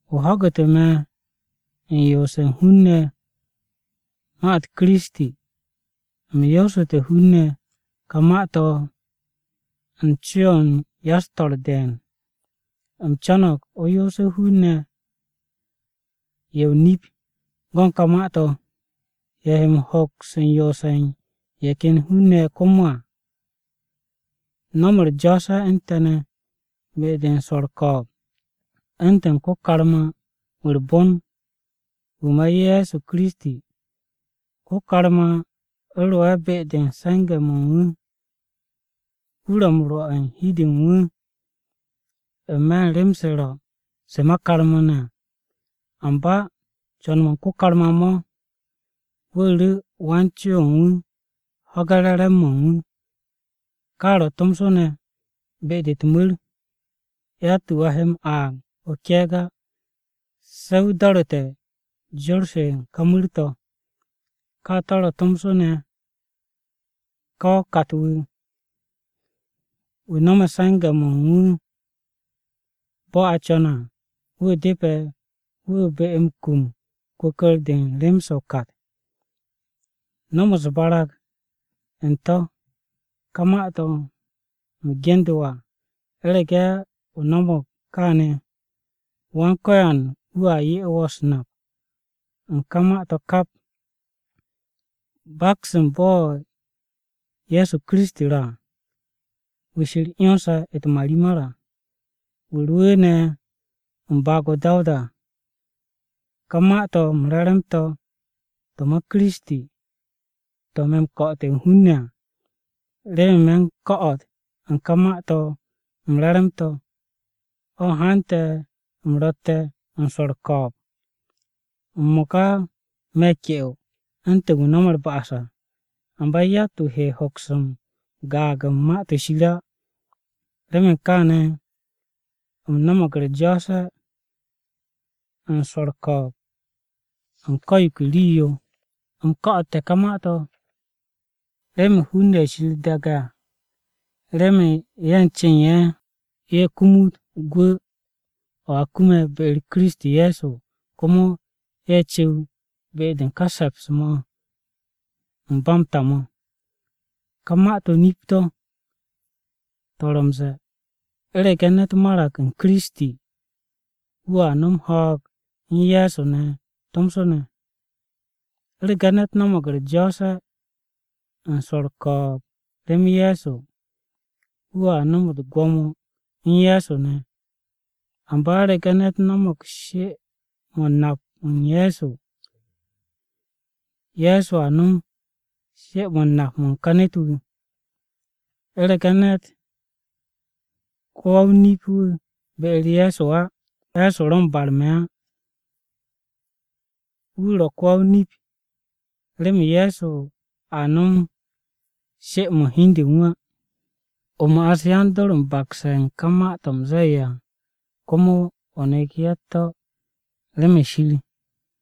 O ho̱gu̱te̱ me̱ u̱n yoose̱ u̱n hun-ne̱ ma-u̱t Kiristi. U̱m yoosu̱te̱ hun-ne̱ ka ma-to̱ u̱n co-o̱ u̱n ya-u̱s-to̱r de̱e̱n. U̱m co̱no̱g o yoose̱ hun-ne̱ ye̱ o-nip go̱n ka ma-to̱. Ye̱ he m-hoks u̱n yoose̱ u̱n ye̱ ken hun-ne̱ komo à. No̱m u̱r-jo̱o̱se̱ u̱n te̱ ne̱, be-de u̱n swo̱ u̱r-ko̱o̱b, u̱ntu̱n ko-karma-wu̱ u̱r-bon, wu̱ ma Ye̱so Kiristi. Ko-karma ro'e̱ be-de u̱n se̱nge̱-mo̱ u̱n wu̱. Wu̱ ro̱ m-rwo̱ u̱n hi u̱n de u̱n wu̱, n-me̱ u̱n rem-se ro̱ se u̱n karma-ne̱ á. Amba co̱n-mo̱ u̱n ko-karma mo̱, wu̱ ru̱ wan-co o̱ u̱n wu̱ ho̱ge̱ re̱re̱m-mo̱ u̱n wu̱. Ka ro̱ tomso ne̱ be-de u̱t-mu̱r, yatt-wu̱ a he m-aag o-ke̱e̱g á, se̱ wu̱ do̱ru̱te̱ jor-se u̱n ka mu̱r-to̱. Ka ro̱ tomso ne̱ ko-wa-o-kat wu̱ no̱me̱ se̱nge̱-mo̱ u̱n wu̱ bo̱ a co̱ne̱ à. Wu̱ depe̱ wu̱ be m-kum kwu̱kwu̱r-de u̱n rem-se o-kat. No̱m u̱s-barag u̱n to̱ ka ma-to̱ u̱m ge̱ndu̱ wo̱ à. U̱rege̱ o no̱mo̱g kaane̱, Wan-Ko̱yan wu̱a 'ye wo̱ u̱s-nap, u̱n ka ma-to̱ kap. Baks u̱n bo̱ Ye̱so Kiristi ro̱ à. Wu̱ Shir 'yonse̱ u̱t-marimar à, wu̱ rwu̱u̱ne̱ u̱n baag-o Dawuda à, ka Ma-to̱ m-Re̱re̱m to̱, to̱ ma Kiristi, to̱ me̱ m-ko̱'o̱te̱ u̱n hun-ne̱ à. Remen me̱ u̱n ko̱'o̱t u̱n ka Ma-to̱ m-Re̱re̱m to̱, o̱ hante̱ u̱m ro̱tte̱ u̱n swo̱ u̱r-ko̱o̱b. M-mo̱ka me̱ ke'o u̱ntu̱n wu̱ no̱me̱ u̱r-ba'as à. Amba yatt-wu̱ he hoks m-gaag u̱n Ma-to̱ Shir á. Remen kaane̱, u̱m no̱mo̱g u̱r-jo̱o̱se̱ u̱n swo̱ u̱r-ko̱o̱b u̱n ko̱ yo ke rii-yo. U̱m ko̱'o̱te̱ ka ma-to̱, remen hun-ne̱ ye̱ Shir daage̱ à. Remen ye̱, u̱n ce u̱n ye̱, ye̱ kumut gwu̱ o̱ a m-kum be-u̱r Kiristi Ye̱so à, komo ye̱ cu̱w be-de u̱n ka se̱ps-mo̱ u̱n ba m-ta mo̱. Ka ma-to̱ nip-o̱, to̱ ro̱ m-ze̱e̱, U̱rege̱ ne̱t marag u̱n Kiristi, wu̱a no̱m m-ho̱o̱g u̱n Ye̱so ne̱ tomso ne̱. U̱rege̱ ne̱t no̱mo̱g u̱r-jo̱o̱se̱ u̱n swo̱ u̱r-ko̱o̱b rem Ye̱so, wu̱a no̱m u̱t-gwo̱mo u̱n Ye̱so ne̱. Amba u̱rege̱ ne̱t no̱mo̱g she-mo̱ u̱n nap u̱n Ye̱so, Ye̱so a no̱m she-mo̱ u̱n nap u̱n ka ne̱t-wu̱. U̱rege̱ ne̱t ko-wa-o-nip-wu̱ be-u̱r Ye̱so á, Ye̱so ro̱ m-barme̱ á, wu̱ ro̱ ko-wa-o-nip. Remen Ye̱so a no̱m she-mo̱ u̱n hi u̱n de u̱n wu̱ á. O ma'as yan-dor m-bakse̱ u̱n ka ma-to̱ u̱m ze̱e̱ à, komo o nek ye̱ u̱t-to̱ remen Shir.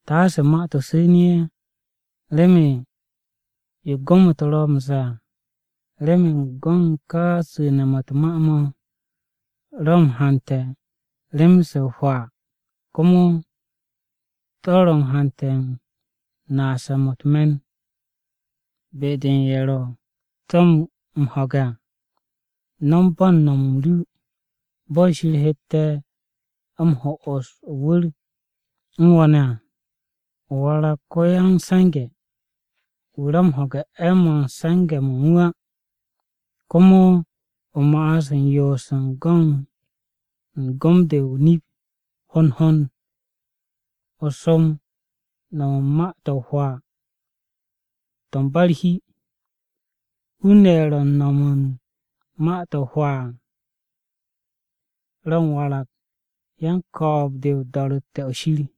Taase ma-to̱ su̱nu̱ ye̱, remen yo gom-u̱t ro̱ m-ze̱e̱ à. Remen go̱n ka su̱ne̱-mo̱ u̱t-ma mo̱ ro̱ m-hante̱ rem-se o-hwaa. Komo to̱ ro̱ u̱n hante̱ u̱n naase̱-mo̱ u̱t-me̱n be-de u̱n ye̱ ro̱ to̱ m-ho̱ge̱ à. No̱m bo̱ u̱n no̱m-m ru, bo̱ Shir hette̱ m-ho'os o-wu̱r u̱n wo̱ ne̱ à. O warag ko-ya-m-se̱nge̱, wu̱ ro̱ m-ho̱ge̱ 'e̱-mo̱ u̱n se̱nge̱-mo̱ u̱n wu̱ á. Komo o ma'as u̱n yoos u̱n gom-de o-nip hond hond. O som no̱m u̱n ma-to̱ o-hwaa to̱ u̱n ba u̱r-hi. Hun-ne̱ ye̱ ro̱ u̱n no̱m u̱n ma-to̱ o-hwaa à, ro̱ m-warag yan-ko̱o̱b-de o-do̱ro̱tte̱ o̱ Shir.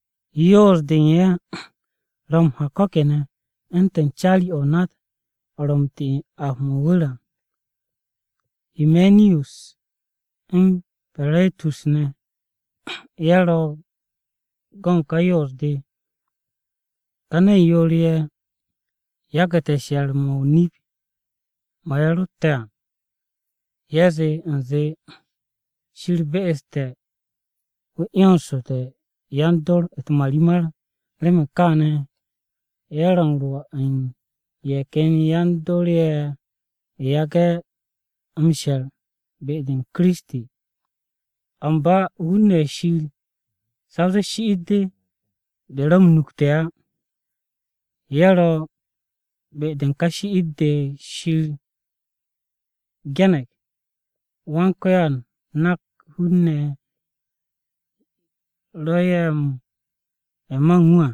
Yoos-de u̱n ye̱ ro̱ m-ha ko̱ kene̱ u̱ntu̱n caari-o̱ o-nat, o̱ ro̱ m-ti u̱n ap-mo̱ o-wu̱r à. Himeniyus u̱n Peretus ne̱, ye̱ ro̱ u̱n go̱n ka yoos-de. Ka ne̱n yoor-ye̱, yagu̱te̱ she̱r-mo̱ o-nip mo̱ ye̱ rotte̱ à. Ye̱ zee u̱nze Shir be'este̱ wu̱ 'yonsu̱te̱ yan-dor u̱t-marimar. Remen kaane̱, ye̱ ro̱ u̱n rwo̱ u̱n ye̱ ken yan-dor ye̱ yage̱ m-she̱r be-u̱r Kiristi. Amba hun-ne̱ ye̱ Shir sa o zee shi'it-de ro̱ m-nukte̱ á ye̱ ro̱. Be-de u̱n ka shi'it-de Shir ge̱ne̱g: “Yawe nak hun-ne̱ ye̱ ro̱ ye̱ ma u̱n wu̱ à.”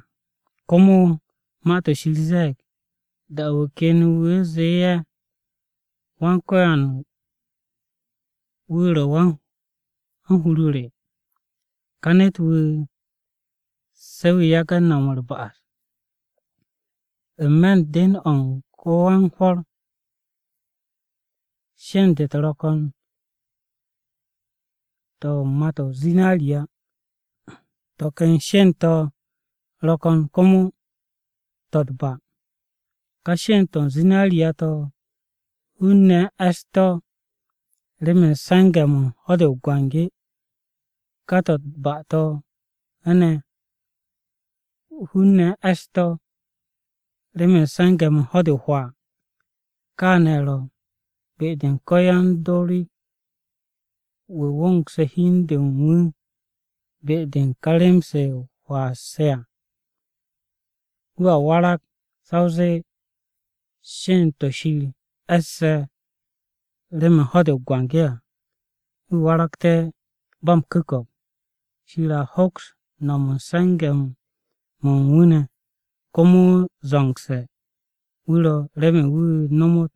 Komo Ma-to̱ Shir ze̱e̱g, “Da-o̱ wu̱ ken, wu̱ zee ye̱, ‘Yawe wu̱ ro̱ Wan-hur re.’ Ka ne̱t-wu̱, se̱ wu̱ yage̱ no̱m u̱r-ba'as.” N-me̱ u̱n den-o̱ u̱n ko-wan-hwo̱r, sheend-u̱t ro̱ ko̱n to̱ u̱n mà-to̱ o-zinariya, to̱ ken sheend-to̱ ro̱ ko̱n komo to̱ u̱t-ba. Ka sheend-to̱ o-zinariya to̱, hun-ne̱ u̱n e̱ss-to̱ remen se̱nge̱-mo̱ u̱n ho̱-de o-biki. Ka to̱ u̱t-ba to̱ ne̱ hun-ne̱ u̱n e̱ss-to̱ remen se̱nge̱-mo̱ u̱n ho̱-de o-hwaa. Kaane̱ ro̱ be-de u̱n ko-yan-dor-wu̱ wo̱ngse̱ hi u̱n de u̱n wu̱ be-de u̱n ka rem-se o-hwaa se à, wu̱a warag sa o zee sheend-to̱ Shir e̱sse̱ remen ho̱-de o-biki à. Wu̱ waragte̱ ba m-ku̱ko̱p, Shir a hoks no̱m m-se̱nge̱ u̱n wu̱ ne̱. Komo zo̱ngse̱ wu̱ ro̱ remen wu̱ nomot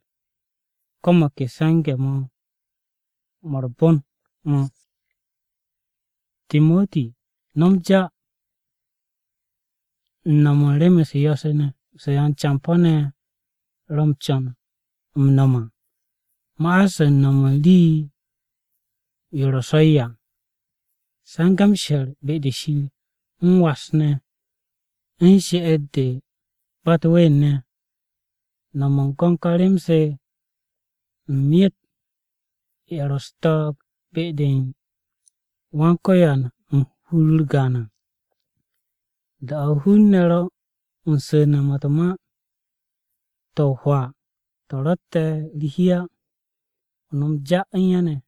ko̱ mo̱ ke go̱n se̱nge̱-mo̱ u̱r-bon mo̱. Timoti no̱m ja, u̱n no̱m u̱n rem-u̱s yo̱-se ne̱, se yan-campo̱-ne̱ ro̱ m-co̱n m-no̱m à. Ma'as u̱n no̱m u̱n rii-yo ro̱ so̱-yo à. Se̱nge̱ m-she̱r be-de Shir, m-was ne̱, u̱n she'et-de ba u̱t-ween ne̱. No̱m u̱n go̱n ka rem-se, u̱n myet ye̱ ro̱ u̱s-ko̱n be-u̱r Wan-Ko̱yan u̱n hur-u̱r gaan à. Da-o̱ hun-ne̱ ro u̱n su̱ne̱-mo̱ u̱t-ma to̱ o-hwaa to̱ ro̱tte̱ u̱r-hi á, o no̱m ja u̱n ye̱ ne̱.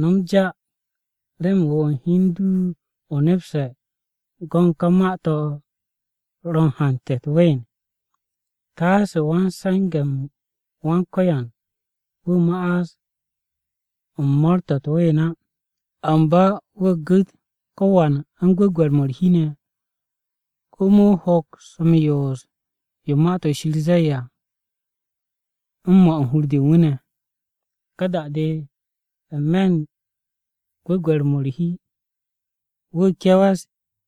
No̱m ja remen wo̱ u̱n hi u̱n du o nepse̱ go̱n ka ma-to̱ ro̱ m-hante̱ u̱t-ween. Taase wan-se̱nge̱-m Wan-Ko̱yan wu̱ ma'as u̱n mo̱o̱r-to̱ u̱t-ween á. Amba wu̱ gu̱t ko̱wan u̱n gwu̱gwe̱r-mo̱ u̱r-hi ne̱, komo wu̱ hoks m-yoos yo Ma-to̱ Shir ze̱e̱ à, u̱n mo̱ u̱n hur-de u̱n wu̱ ne̱. Ka da-de, n-me̱ u̱n gwu̱gwe̱r-mo̱ u̱r-hi, wu̱ ke̱we̱s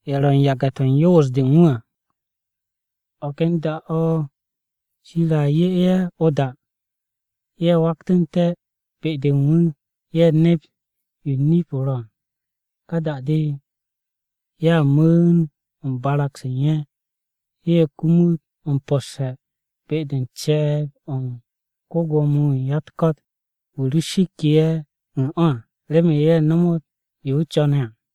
ye̱ ro̱ u̱n yage̱-to̱ u̱n yoos-de u̱n wu̱ à. O̱ ken da-o̱ Shir a 'ye ye̱ o-da, ye̱ waktu̱ne̱ be-de u̱n wu̱, ye̱ nep yo nip-o ro̱ à. Ka da-de, ye̱a mu̱u̱n u̱n barag-se u̱n ye̱, ye̱ kumut m-po̱sse̱ be-de u̱n ce̱e̱b-o̱ u̱n ko-Gwo̱mo-wu̱ u̱n ya-u̱t-ko̱t. Wu̱ ro shikke̱ ye̱ u̱n o̱ à, remen ye̱ nomot yo wu̱ co̱ne̱ à.